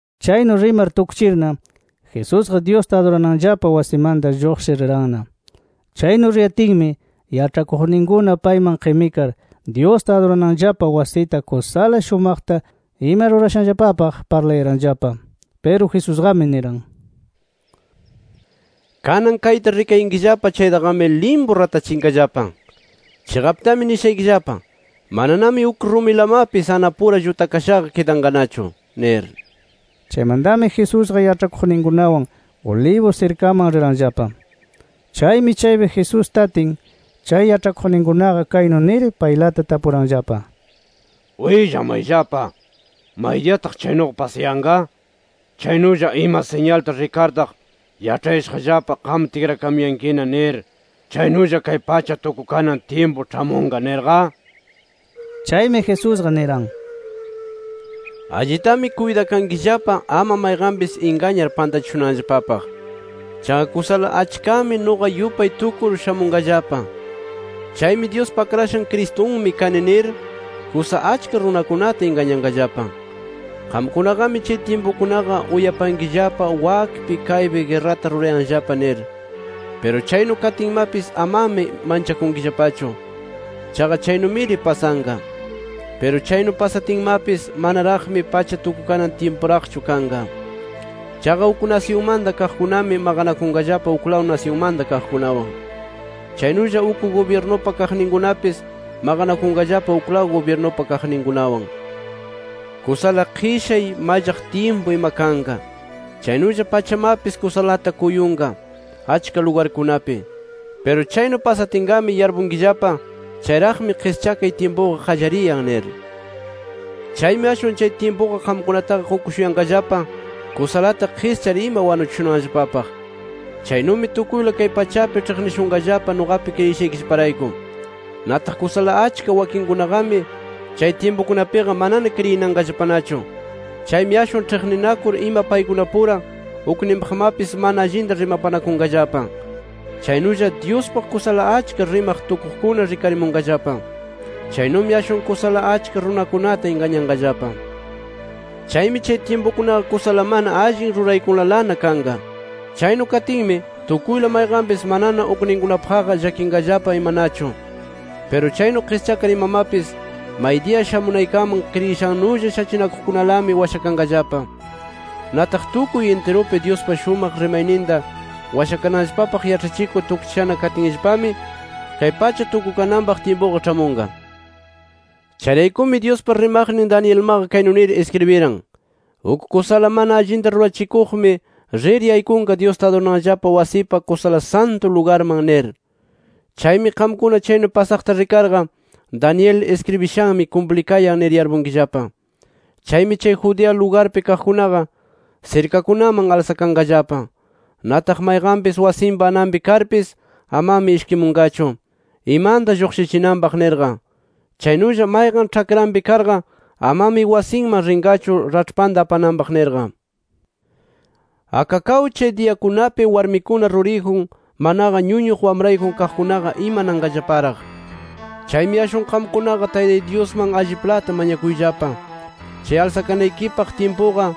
Chaynu rimar tukchirna, Jesusqa Dyusta adurananllapa wasimanta lluqshir riranna. Chaynu riyatinmi, yaĉhakuqninkuna payman qimikar, Dyusta adurananllapa wasita kusala shumaqta ima rurashanllapapaq parlayaranllapa. Piru Jesusqami niran: “Kanan kayta rikayankillapa chaytaqami, limpu ratachinqallapa. Chiqaptami nishaykillapa: Mananami uk rumilamapis anapura llutakashaqa kidanqanachu nir”. Chaymantami Jesusqa yaĉhakuqninkunawan Olivos sirkaman riranllapa. Chaymi chaypi Jesús tatin, chay yaĉhakuqninkunaqa kaynu nir paylata tapuranllapa: —Willamayllapa: ¿Maydiyataq chaynuqa pasayanqa? Chaynulla ¿ima siñalta rikartaq yaĉhayashaqllapa qam tikrakamuyankina nir, chaynulla kay pacha tukukanan tyimpu ĉhamunqa nirqa? Chaymi, Jesusqa niran: —Allitami kuytakankillapa, ama mayqanpis ingañar pantachishunanllapapaq. Chaqa kusala achkami nuqa yupay tukur shamunqallapa. Chaymi, ‘Dyuspa Akrashan Cristunmi kani’ nir, kusa achka runakunata ingañanqallapa. Qamkunaqami chay tyimpukunaqa uyapankillapa wakpi kaypi guerrata rurayanllapa nir. Piru chaynu katinmapis amami manchakunkillapachu. Chaqa chaynumiri pasanqa. Piru chaynu pasatinmapis manaraqmi pacha tukukanan tyimpuraqchu kanqa. Chaqa uk nasyunmanta kaqkunami maqanakunqallapa uklaw nasyunmanta kaqkunawan. Chaynulla uk gubyirnupa kaqninkunapis maqanakunqallapa uklaw gubyirnupa kaqninkunawan. Kusala qishay, mallaq tyimpu ima kanqa. Chaynulla pachamapis kusalata kuyunqa achka lugarkunapi. Piru chaynu pasatinqami yarpunkillapa, chayraqmi qischakay tyimpuqa qallariyan nir. “Chaymi ashwan chay tyimpuqa qamkunataqa qukushuyanqallapa kusalata qischar ima wanuchishunanllapapaq. Chaynumi tukuyla kay pachapi ĉhiqnishunqallapa nuqapi kriyishaykillaparayku. Nataq kusala achka wakinnikikunaqami chay tyimpukunapiqa manana kriyinanqallapanachu. Chaymi ashwan ĉhiqninakur ima paykunapura ukninpaqmapis mana allinta rimapanakunqallapa. Chaynulla Dyuspaq kusala achka rimaq tukuqkuna rikarimunqallapa. Chaynumi ashwan kusala achka runakunata ingañanqallapa. Chaymi chay tyimpukunaqa kusala mana allin ruraykunalana kanqa. Chaynu katinmi, tukuyla mayqanpis manana ukninkunapaqqa llakinqallapa imanachu. Piru chaynu qischakar imamapis maydiya shamunaykaman kriyishannulla shachinakuqkunalami washakanqallapa. Nataq tukuy intirupi Dyuspa shumaq rimayninta washakananllapapaq yaĉhachikur tukchishana katinllapami, kay pacha tukukananpaq tyimpuqa ĉhamunqa. “Chayraykumi Dyuspa rimaqnin Danielmaqa kaynu nir iskribiran: ‘Uk kusala mana allinta rurachikuqmi rir yaykunqa, Dyusta adurananllapa wasipa Kusala Santu Lugarman’ nir. Chaymi qamkuna chaynu pasaqta rikarqa, Daniel iskribishanmi kumplikayan nir yarpunkillapa. Chaymi chay Judea lugarpi kaqkunaqa sirkakunaman alsakanqallapa. Nataq mayqanpis wasinpa ananpi karpis, amami ishkimunqachu, imanta lluqshichinanpaq nirqa. Chaynulla, mayqan ĉhakranpi karqa amami wasinman rinqachu raĉhpanta apananpaq nirqa. ¡Akakaw chay diyakunapi warmikuna ruriyjun, manaqa ñuñuq wamrayjun kaqkunaqa imananqallaparaq! Chaymi ashwan qamkunaqa Taytay Dyusman alliplata mañakuyllapa, chay alsakanaykipaq tyimpuqa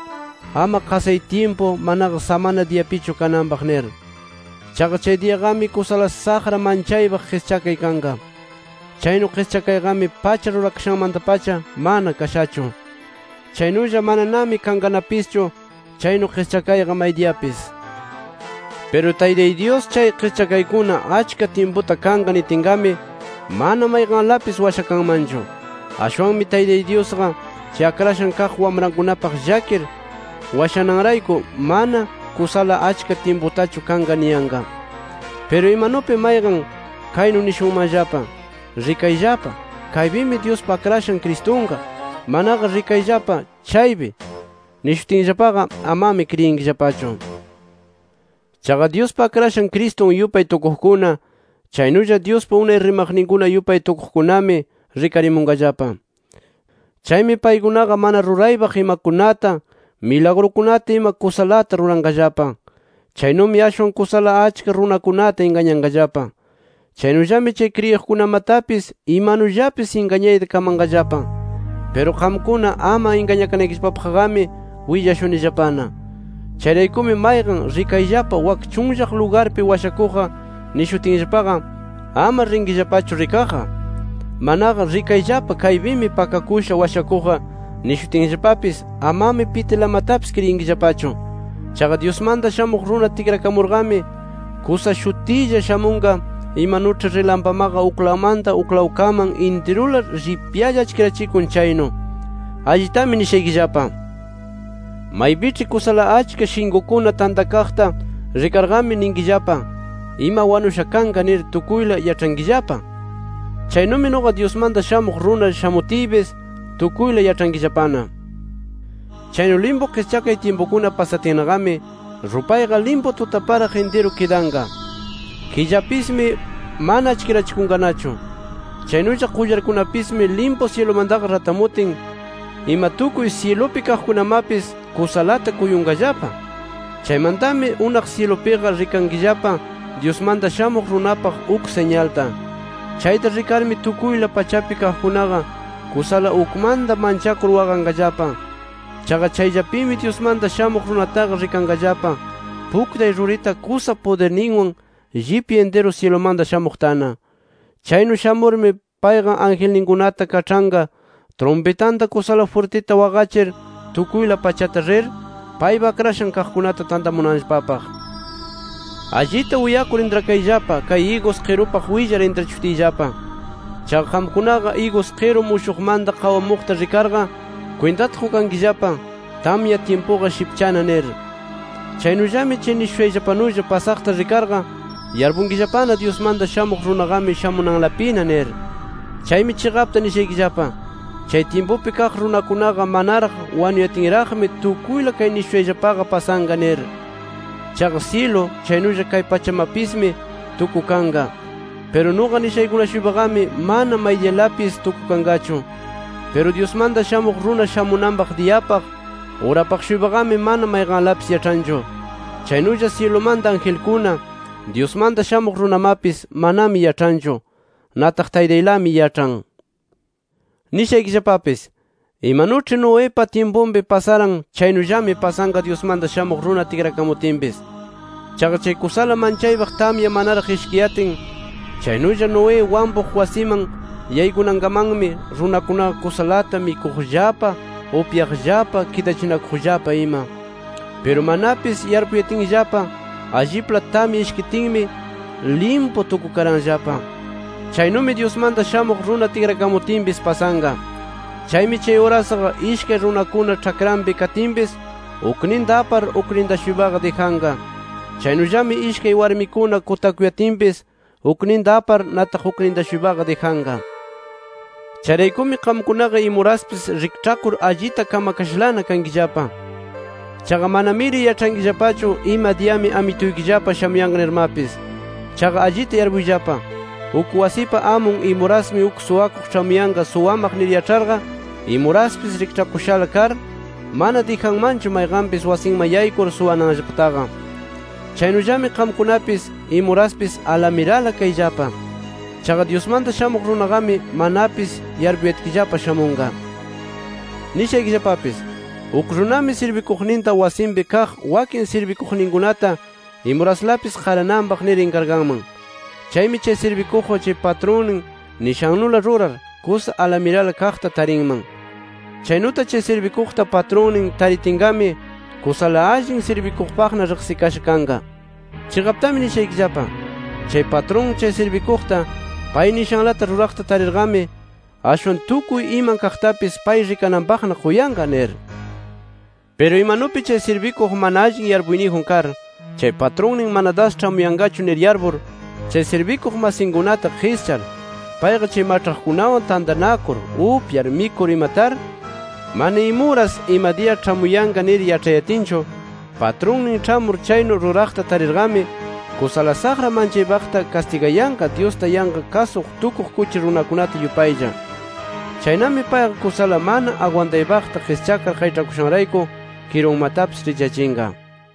ama qasay tyimpu, manaqa samana diyapichu kananpaq nir. Chaqa, chay diyaqami kusala saqra manchaypaq qischakay kanqa. Chaynu qischakayqami pacha rurakashanmanta-pacha mana kashachu. Chaynulla mananami kanqanapischu chaynu qischakayqa maydiyapis. Piru Taytay Dyus chay qischakaykuna achka tyimputa kanqa nitinqami, mana mayqanlapis washakanmanchu. Ashwanmi Taytay Dyusqa chay akrashan kaq wamrankunapaq llakir washananrayku, mana kusala achka tyimputachu kanqa niyanqa. “Piru imanupi mayqan kaynu nishunmanllapa: ‘Rikayllapa kaypimi Dyuspa Akrashan Cristunqa’, manaqa ‘Rikayllapa chaypi’ nishutinllapaqa, amami kriyinkillapachu. Chaqa Dyuspa Akrashan Cristun yupay tukuqkuna, chaynulla Dyuspa unay rimaqninkuna yupay tukuqkunami rikarimunqallapa. Chaymi paykunaqa mana ruraypaq imakunata, milagrukunata ima kusalata ruranqallapa. Chaynumi ashwan kusala achka runakunata ingañanqallapa. Chaynullami chay kriyiqkunamatapis imanullapis ingañayta kamanqallapa. Piru qamkuna ama ingañakanaykillapapaqqami willashunillapana. Chayraykumi mayqan ‘Rikayllapa wak chunllaq lugarpi washakuqqa’ nishutinllapaqa, ama rinkillapachu rikaqqa. Manaqa ‘Rikayllapa kaypimi pakakusha washakuqqa’ nishutinllapapis, amami pitilamatapis kriyinkillapachu. Chaqa Dyusmanta Shamuq Runa tikrakamurqami, kusa shutilla shamunqa, imanuĉhi rilampamaqa uklawmanta uklawkaman intirula llipyalla achkirachikun chaynu. Allitami nishaykillapa: Maypiĉhi kusala achka shinkukuna tantakaqta rikarqami ninkillapa, ima wanusha kanqa nir tukuyla yaĉhankillapa. Chaynumi nuqa Dyusmanta Shamuq Runa shamutiypis tukuyla yaĉhankillapana. “Chaynu limpu qischakay tyimpukuna pasatinnaqami, rupayqa limpu tutaparaq intiru kidanqa. Killapismi mana achkirachikunqanachu. Chaynulla qullarkunapismi limpu syilumantaqa ratamutin ima tukuy syilupi kaqkunamapis kusalata kuyunqallapa. Chaymantami unaq syilupiqa rikankillapa Dyusmanta Shamuq Runapaq uk siñalta. Chayta rikarmi tukuyla pachapi kaqkunaqa kusala ukmanta manchakur waqanqallapa. Chaqa chayllapimi Dyusmanta Shamuq Runataqa rikanqallapa, puktay rurita kusa pudirninwan, llipya intiru syilumanta shamuqtana. Chaynu shamurmi payqa angelninkunata kaĉhanqa trumpitanta kusala jwirtita waqachir tukuyla pachata rir, paypa akrashan kaqkunata tantamunanllapapaq. “Allita uyakur intrakayllapa kay igus qirupaq willar intrachishutiyllapa. Chaqa qamkunaqa igus qiru mushuqmanta qawamuqta rikarqa kwintata qukankillapa, tamya tyimpuqa shipchana nir. Chaynullami chay nishushayllapanulla pasaqta rikarqa yarpunkillapana Dyusmanta Shamuq Runaqami shamunanlapina nir. Chaymi chiqapta nishaykillapa: Chay tyimpupi kaq runakunaqa manaraq wanuyatinraqmi tukuyla kay nishushayllapaqa pasanqa nir. Chaqa syilu chaynulla kay pachamapismi tukukanqa. Piru nuqa nishaykuna-shuypaqami mana maydiyalapis tukukanqachu. Piru Dyusmanta Shamuq Runa shamunanpaq diyapaq, urapaq-shuypaqami, mana mayqanlapis yaĉhanchu. Chaynulla syilumanta angelkuna, Dyusmanta Shamuq Runamapis manami yaĉhanchu. Nataq Taytaylami yaĉhan. “Nishaykillapapis: Imanuĉhi Noepa tyimpunpi pasaran chaynullami pasanqa Dyusmanta Shamuq Runa tikrakamutinpis. Chaqa chay kusala manchaypaq tamya manaraq ishkiyatin, chaynulla Noé wampuq wasiman yaykunankamanmi, runakunaqa kusalata mikuqllapa, upyaqllapa, kidachinakuqllapa ima. Piru manapis yarpuyatinllapa alliplata tamya ishkitinmi limpu tukukaranllapa. Chaynumi Dyusmanta Shamuq Runa tikrakamutinpis pasanqa. Chaymi chay urasqa ishkay runakuna ĉhakranpi katinpis, ukninta apar, ukninta-shuypaqa dijanqa. Chaynullami ishkay warmikuna kutakuyatinpis, ukninta apar, nataq ukninta-shuypaqa dijanqa. “Chayraykumi qamkunaqa imuraspis rikĉhakur allita kamakashalana kankillapa. Chaqa manamiri yaĉhankillapachu ima diyami Amituykillapa shamuyanqa nirmapis. Chaqa allita yarpuyllapa: Uk wasipa amun imurasmi uk suwakuq ĉhamuyan suwamaq nir yaĉharqa, imuraspis rikĉhakushala kar, mana dijanmanchu mayqanpis wasinman yaykur suwananllapataqa. Chaynullami qamkunapis, imuraspis alamirala kayllapa. Chaqa Dyusmanta Shamuq Runaqami, manapis yarpuyatkillapa shamunqa. “Nishaykillapapis: Uk runami sirbikuqninta wasinpi kaq wakin sirbikuqninkunata imuraslapi qarananpaq nir inkarganman. Chaymi chay sirbikuqqa chay patrunnin nishannula rurar, kusa alamirala kaqta tarinman. Chaynuta chay sirbikuqta patrunnin taritinqami, kusala allin sirbikuqpaqna riqsikasha kanqa. Chiqaptami nishaykillapa: Chay patrun chay sirbikuqta pay nishanlata ruraqta tarirqami, ashwan tukuy iman kaqtapis pay rikananpaqna quyanqa nir. Piru imanupi chay sirbikuq mana allin yarpuyniyjun kar, chay patrunnin mana das ĉhamuyanqachu nir yarpur, chay sirbikuq masinkunata qischar, payqa chay maĉhaqkunawan tantanakur upyar mikur ima tar, mana imuras ima diya ĉhamuyanqa nir yaĉhayatinchu, patrunnin ĉhamur chaynu ruraqta tarirqami, kusala saqra manchakuypaqta kastigayanqa Dyusta yanqa kasuq tukuq kuchi runakunata yupaylla. Chaynami payqa kusala mana agwantaypaqta qischakar qayĉhakushanrayku kirunmatapis richyachinqa”.